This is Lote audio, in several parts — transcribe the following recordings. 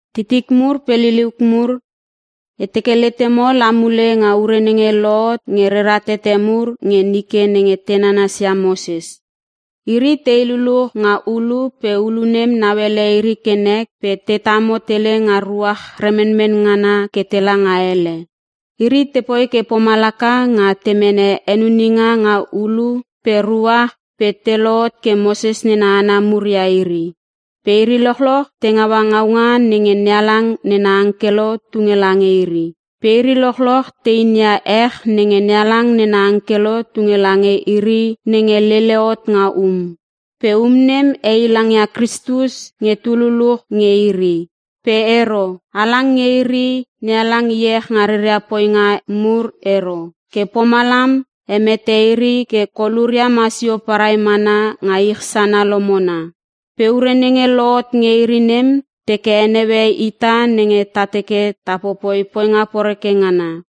Titik mur pe liliuk mur, e teke letemo la mule nga ure nenge lohot nge rera tete mur nge nike nenge te nanasia Moses. Iri tei luluch nga ulu pe ulu nem nauele iri ke nek pe te tamo tele nga ruach remenmen ngana ke tela nga ele. Iri tepoi ke pomalaka nga te mene henuninga nga ulu pe ruach pe te lohot ke Moses nena hana mur ia iri. Pe iri lochloch te ngaua ngaunga nenge NeHalang nena angkelo tunge lange iri. Pe iri lochloch te inia ech nenge NeHalang nena angkelo tunge lange iri nenge lele hot nga um. Pe um nem heilang ia Kristus nge tu luluch nge iri. Pe ero. Halang nge iri, NeHalang iech nga reria poinga mur ero. Ke pomalam hemete iri ke koluria masio parai mana nga ich sana lomona. Pe ure nenge lohot nge iri nem teke heneue ita nenge ta teke ta popoi poinga poreke ngana.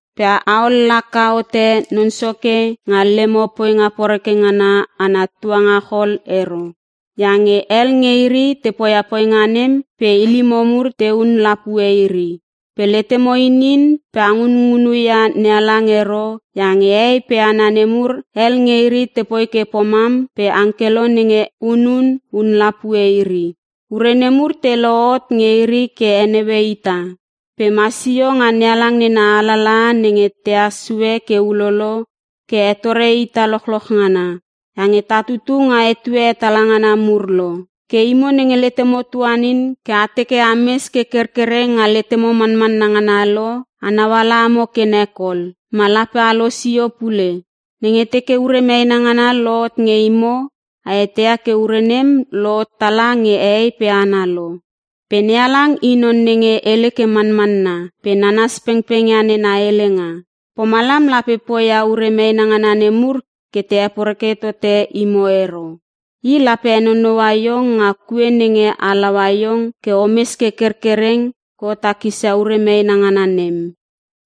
Pe a ollaka hote Non Soke nga lemo poinga poreke ngana ana tuangachol ero. Iange hel nge iri te poia poinga nem pe ilimo mur tehun lapue iri. Pe letemo inin pe a ngungunu ia NeHalang ero iange hehei pe hana nemur, hel nge iri tepoi ke pomam pe angkelo nenge hunun, hun lapue iri. Ure nemur te lohot nge iri ke heneue ita. Pe masio nga NeHalang nena alalaha nenge tehas sue ke ulolo ke hetore ita lochloch ngana, iange ta tutu nga etue hetala ngana mur lo. Ke imo nenge letemo tuanin ke a teke ames ke kerkereng nga letemo manmanna ngana lo, a nauala amo ke nek ol, ma lape a losio pule. Nenge teke ure meena ngana lohot nge imo a eteia ke ure nem lohot tala nge hehei pe hana lo. Pe NeHalang i non nenge hele ke manmanna pe nanas pengpeng ia nena helenga. Pomalam lape poia ure meena ngana nemur ke te heporeke tote imo ero. I lape henonoua iong nga kue nenge halaua iong ke omes ke kerkereng ke o takisia ure meena ngana nem.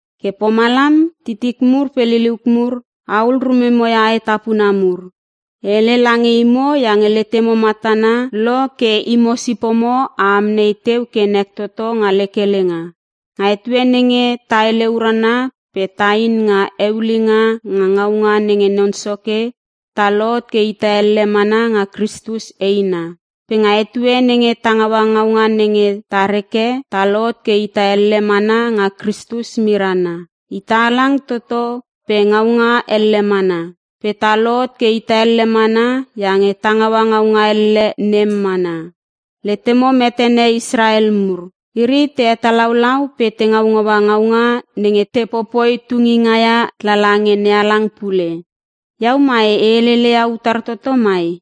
Ke pomalam titik pe liliuk mur, ahul rumemo ia aetapuna mur. E hele lange imo iange letemo matana lo ke imo sipomo a amnei teu ke nek toto nga lek helenga. Nga etue nenge ta hele urana pe tain nga eulinga nga ngaunga nenge Non Soke, ta lohot ke ita elle mana nga Kristus eina. Pe nga etue nenge ta ngaua ngaunga nenge ta reke, ta lohot ke ita elle mana nga Kristus mirana. Ita halang toto pe ngaunga elle mana. Pe ta lohot ke ita elle mana iange ta ngaua ngaunga elle nem mana. Letemo metene Israel mur. Iri te hetalaulau pe te ngaungaua ngaunga nenge te popoi tunginga ia lala nge NeHalang pule. Iau mai e helele ia utar toto mai?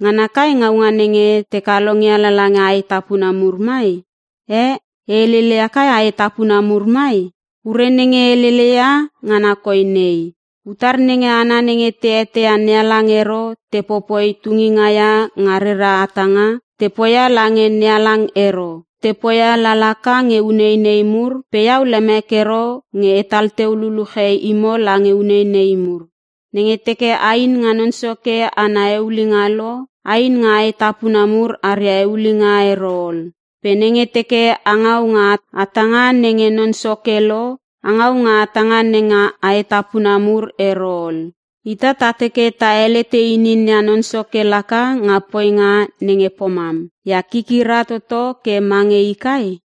Ngana kai ngaunga nenge te kalongia lala nge aetapuna mur mai? Eh, e helele ia kai aetapuna mur mai? Ure nenge e helele ia ngana koi nei; Utar nenge hana nenge te eteia NeHalang ero te popoi tunginga ia nga reria hatanga, te poia lange NeHalang ero. Te poia la laka nge uneinei mur pe iau lemek ero nge atal teu luluche imo lange uneinei mur. Nenge teke ain nga Non Soke ana eulinga lo, ain nga aetapuna mur aria eulinga ero ol. Pe nenge teke a ngau nga hatanga nenge Non Soke lo, a ngau nga hatanga nenge aetapuna mur ero ol. Ita ta teke ta helete inin ia Non Soke laka nga poinga nenge pomam. Ia kikira toto ke mange i kai?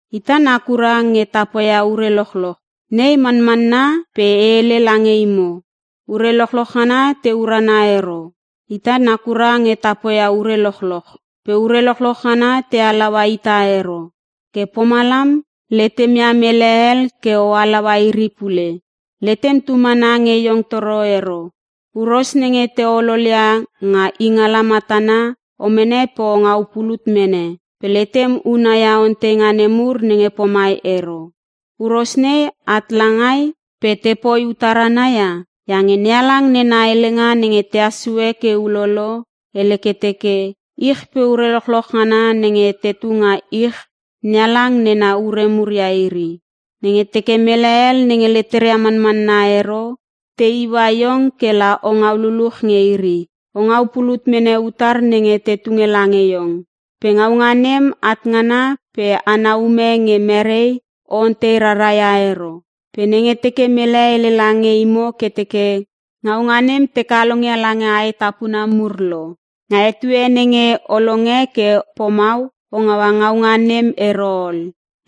“Ita nakura nge ta poia ure lochloch.” Nei manmanna pe e hele lange imo, ure lochloch ngana te urana ero. “Ita nakura nge ta poia ure lochloch.” Pe ure lochloch ngana te halaua ita ero. Ke pomalam letemia mele hel ke o halaua iri pule. Letem tu mana nge iong toro ero. Huros nenge te ololia nga ingala matana o mene pe o ngau pulut mene. Pe letem una ia onteinga nemur nenge pomai ero; “Huros nei at langai pe tepoi utar ana ia?” Iange NeHalang nena helenga nenge tehas sue ke ulolo, hele ke teke, “Ich pe ure lochloch ngana nenge tetu nga ich NeHalang nena ure mur ia iri.” Nenge teke mele hel nenge leteria manmanna ero, te iua iong kela o ngau luluch nge iri, o ngau pulut mene utar nenge te tunge lange iong. Pe ngaunga nem at ngana pe ana ume nge merei o ontei rara ia ero. Pe nenge teke mele hele lange imo ke teke, “Ngaunga nem te kalongia lange aetapuna mur lo.” Nga etue nenge o longe ke pomau o ngaua ngaunga nem ero ol.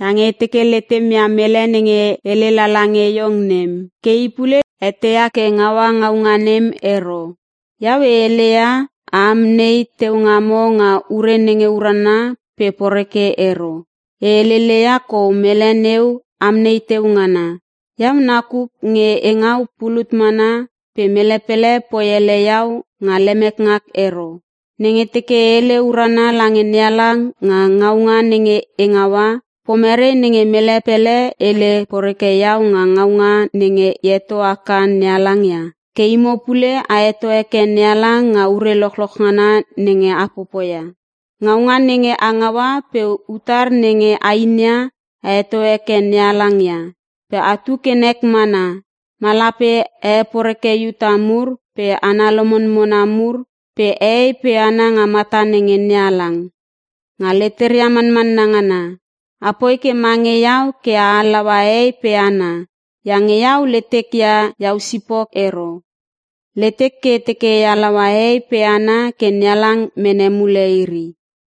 Iange e teke letemia mele nenge hele lala nge iong nem, ke i pule eteia ke ngaua ngaunga nem ero. Iau e heleia a amnei teu ngamo nga ure nenge urana pe poreke ero. E helele ia kou mele neu amnei teu ngana. Iau nakuk nge e ngau pulut mana pe mele pele poi ele iau nga lemek ngak ero. Nenge teke e hele urana lange NeHalang nga ngaunga nenge e ngaua, pomerei nenge mele pele hele poreke iau nga ngaunga nenge e heto haka NeHalang ia? Ke imo pule a heto heke NeHalang nga ure lochloch ngana nenge a popoia. Ngaunga nenge a ngaua pe utar nenge a inia, a heto heke NeHalang ia. Pe atu ke nek mana, ma lape a heporeke Iuta mur pe hana lomonmona mur pe hehei pe hana nga mata nenge NeHalang nga leteria manmanna ngana. Apoi ke mange iau ke a halaua hehei pe hana. Iange iau letek ia iau sipok ero. Letek ke e teke e halaua hehei pe hana ke NeHalang mene mule iri.